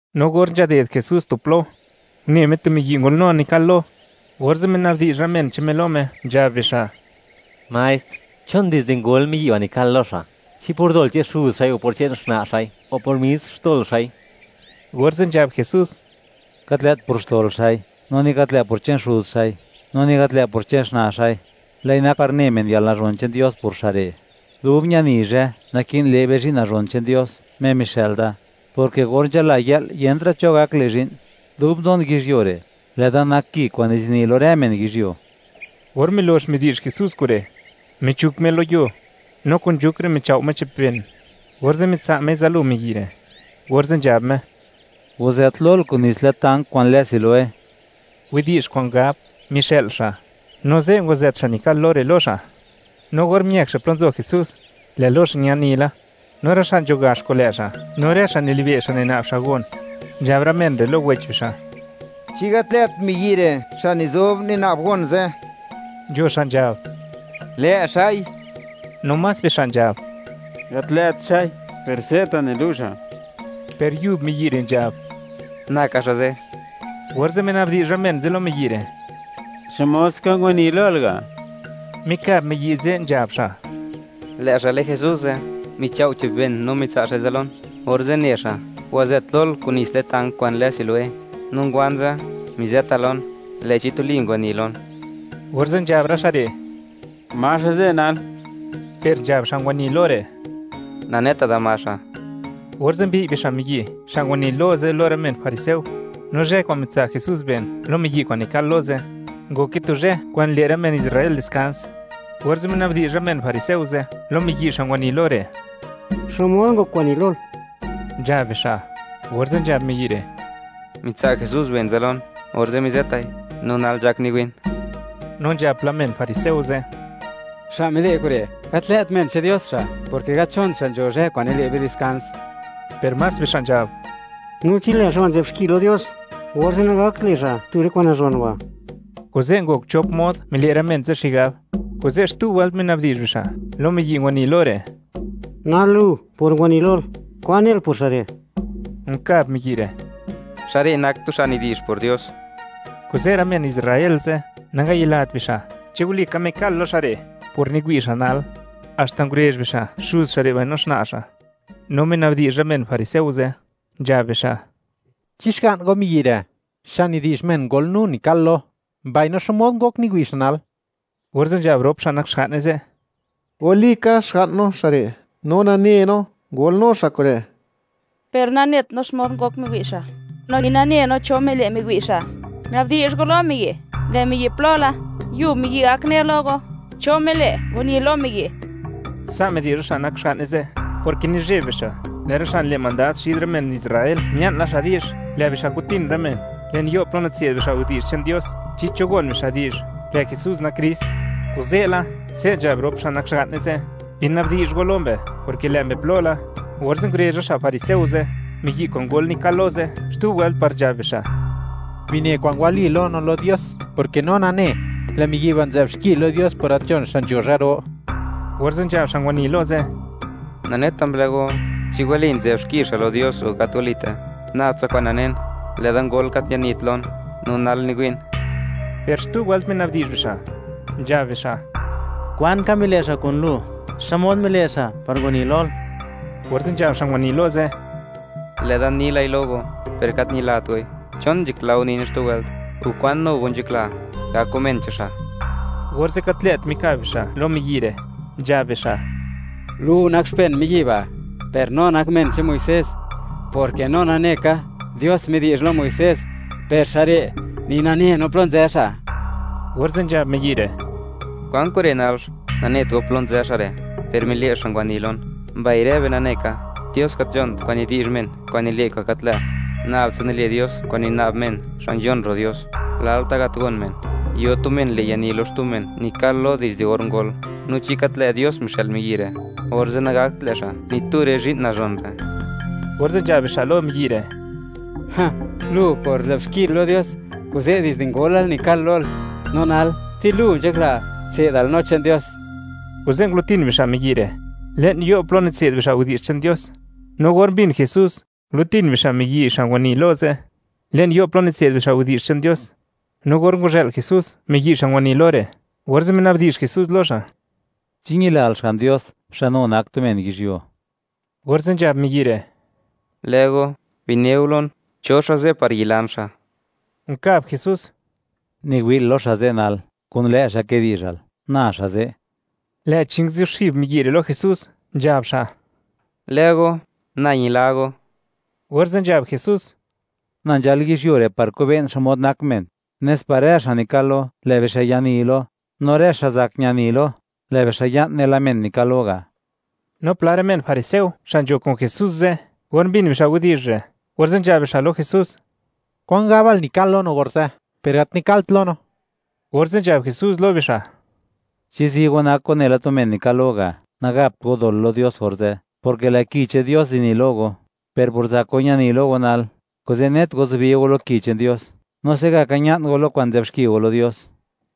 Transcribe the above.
No or nzhaded Jesús tu plo, une Me tu miyi' ngolnu nikal-lo, orze' mina'bdi'zh rë men che'n Me lo Me, nzhab bixa': ―Maestr, ¿chon dizde ngol miyi' ba' nikal-lo xa'? ¿Chi por dol che'n xuz xa'i o por che'n xna' xa'i; o por mis xtol xa'i? Orze' nzhab Jesús: ―Gat lë't por xtol xa'i, no ni gat lë' por che'n xuz xa'i, no ni gat lë' por che'n xna' xa'i; lë'i nak par ne men, yalnazhon che'n Dios por xa' re'. Dub ñani zhë, naki'n le' be zhi'n nazhon che'n Dios, Me mixë'l da, porke or nzhala yë'l, yentra' cho gak le' zhi'n; dub nzon yizhyuo re', lë'da nak Ki kwa'n nizini lo rë men yizhyuo. Or milox midi'zh Jesús kure', michuk Me lo yuo, no kun nzhuk re' michao' Me che'p ben, orze' mitsa' Mei zalo miyi' re', orze' nzhab Me: ―Wazët lol kun nits le'n tank kwa'n lë Siloé (widi'zh kwa'n gab: “Mixë'l xa'”). No ze' ngwazët xa' nikal-lo re' lo xa', no or miëk xa' plo nzo Jesús, lë' lo xa' ñani la. No rë xa' nzho gax kun lë' xa', no rë xa' nilibe' xa' nina'b xa' gon, nzhab rë men re' lo wech bixa': ―¿Chi gat lë't miyi' re' xa' nizob nina'b gon ze'? Nzho xa' nzhab: —Lë' xa'i. No más bixa' nzhab: —Gat lë't xa'i, per se'ta' nilu' xa'. Per yub miyi' re' nzhab: —Na ka xa' ze'. Orze' minabdi'zh rë men ze' lo miyi' re': ―¿Xmod ska ngwani lol ga'? Mikab miyi' ze', nzhab xa': ―Lë' xa' lë Jesús ze', michao' che'p ben no mitsa' xa'i zalon, orze' ne xa': “Wazët lol kun nits le'n tank kwa'n lë Siloé.” No ngwan ze', mizeta lon, lë'chi tuli ngwani lon. Orze' nzhab rë xa' re': ―¿Ma xa' ze' nal? Per nzhab xa' ngwani lo re': ―Naneta da ma xa'. Orze' mbi'y bixa' miyi' xa' ngwani lo ze' lo rë men fariseo, no zhë kwa'n mitsa' Jesús ben lo miyi' kwa'n nikal-lo ze', ngoke tu zhë kwa'n nile' rë men Israel diskans. Orze' minabdi'zh rë men fariseo ze' lo miyi' xa' ngwani lo re': “Xmod ngok ngwani lol”, nzhab bixa'. Orze' nzhab miyi' re': ―Mitsa' Jesús ben zalon, orze' mizëtai, no nal nzhak niwi'n. No nzhab pla men fariseo ze': ―Xa' mile' kure', gat lë't men che'n Dios xa', porke gat nzhont xa' nzho zhë kwa'n nile' be diskans. Per más bixa' nzhab: ―No chi lë' xa' ba' nzë'b xki lo Dios, orze' nagakt le' xa' tu rë kwa'n nazhon ba'. Kuze' ngok chop mod mile' rë men ze' xigab. Kuze' xtu wëlt mina'bdi'zh bixa' lo miyi' ngwani lo re': ―Nal lu, por ngwani lol, ¿kwan nel por xa' re'? Nkab miyi' re': ―Xa' re' nak tu xa' nidi'zh por Dios. Kuze' rë men Israel ze' nangayilat bixa', chi walika mikal-lo xa' re' por niwi' xa' nal, haxta ngurezh bixa' xuz xa' re' no xna' xa', no mina'bdi'zh rë men fariseo ze', nzhab bixa': ―¿Chi xga'n go miyi' re', xa' nidi'zh men, ngolnu nikal-lo? ¿Mbaino xmod ngok niwi' xa' nal? Orze' nzhab rop xa' nak xga'ne ze': ―Walika xga'n no xa' re', no nane no, ngolnu xa' kure', per nanet no xmod ngok miwi' xa', no ni nane no cho mile' miwi' xa'. Una'bdi'zh go lo miyi', lë' xa' plo la, yub xa' gak ne lo go, cho mile' ngwani lo miyi'. Sa' midi'zh rë xa' nak xga'ne ze', porke nizheb bixa', lë' rë xa' nile' mandad xid rë men Israel mia'n la di'zh, lë' bixa' kutin rë men le'n yo' plo nitse'd bixa' widi'zh che'n Dios, chi cho gon bixa' di'zh, lë' Jesús nak Krist. Kuze'la, se' nzhab rop xa' nak xga'ne ze': “Bina'bdi'zh go lo mbe, porke lë' mbe plo la.” Orze' ngurezh rë xa' fariseo ze' miyi' kwa'n ngok nikal-lo ze' xtu wëlt par nzhab bixa': ―Bine kwa'n wali lo no, no lo Dios, porke no nane, lë' miyi' ba' nzë'b xki la lo Dios por gat nzhon xa' nzho zhë ro. Orze' nzhab xa' ngwani lo ze': ―Naneta mblë go, chi wali nzë'b xki xa' lo Dios o gat walite; nab tsa kwa'n nanen, lë'da ngol gat ñanit lon, no nal niwi'n. Per xtu wëlt minabdi'zh bixa', nzhab bixa': ―¿Kwan ka mile' xa' kun lu? ¿Xmod mile' xa' par ngwani lol? Orze' nzhab xa' ngwani lo ze': ―Lë'da ni lai lo go, per gat ñilat goi. ¿Chon nzhakla go nine xtu wëlt?, o, ¿kwan nu go nzhakla, gak go men che'n xa'? Orze' gat lë't mikab bixa' lo miyi' re', nzhab bixa': ―¡Lu nak xpen miyi' ba', per no nak men che'n Muisés!, porke no nane ka, Dios midi'zh lo Muisés, per xa' re', ¡ni nane no plo nzë xa'! Orze' nzhab miyi' re': ―¿Kwan kure' nalx? ¡Nanet go plo nzë xa' re', per mile' xa' ngwani lon! Mbai rë be nane ka, Dios gat nzhont kwa'n nidi'zh men kwa'n nile' kwa'n gat lë'; nab tsa nile' Dios kwa'n nina'b men xa' nzhon ro' Dios. Lalta' gat gon men, yo tu men le' yani lo xtu men nikal-lo dizde or ngol. No chi gat lë' Dios mixë'l miyi' re', orze' nagakt le' xa' ni tu rë zhi'n nazhon re'. Orze' nzhab bixa' lo miyi' re': ―¡Lu, por nzë'b xkil lo Dios, kuze' dizde ngolal nikal-lol! No nal, ¿ti lu nzhakla tse'dal no che'n Dios? Kuze' ngulo'tin bixa' miyi' re' le'n yo' plo nitse'd bixa' widi'zh che'n Dios. No or mbin Jesús, ngulo'tin bixa' miyi' xa' ngwani lo ze', le'n yo' plo nitse'd bixa' widi'zh che'n Dios, no or ngwazhë'l Jesús miyi' xa' ngwani lo re', orze' mina'bdi'zh Jesús lo xa': ―¿Chi ñilal Xga'n Dios, xa' nu nak tu men yizhyuo? Orze' nzhab miyi' re': ―Lë' go, bine go lon, cho xa' ze' par yilan xa'. Nkab Jesús: ―Niwi'l lo xa' ze' nal; kun lë' xa' kidi'zhal; na xa' ze'. Lë'chi nguzuxib miyi' re' lo Jesús, nzhab xa': ―Lë' go, na ñila go. Orze' nzhab Jesús: ―Na nzhal yizhyuo re' par kobe'n xmod nak men, nes par rë xa' nikal-lo, lë' bixa' yani lo; no rë xa' zak ñani lo; lë' bixa' ya'n nela men nikal-lo ga'. No pla rë men fariseo xa' nzo kun Jesús ze', or mbin bixa' widi'zh re', orze' nzhab bixa' lo Jesús: ―¿Kwan gabal, nikal-lo no orze'? Per gat nikalt lo no. Orze' nzhab Jesús lo bixa': ―Chi zi go, nak go nela tu men nikal-lo ga', nagapt go dol lo Dios orze', porke lë' Ki che'n Dios zini lo go; per por zak go ñani lo go nal, kuze' net go zubi go lo Ki che'n Dios, no se'gaka ña'n go lo kwa'n nzë'b xki go lo Dios.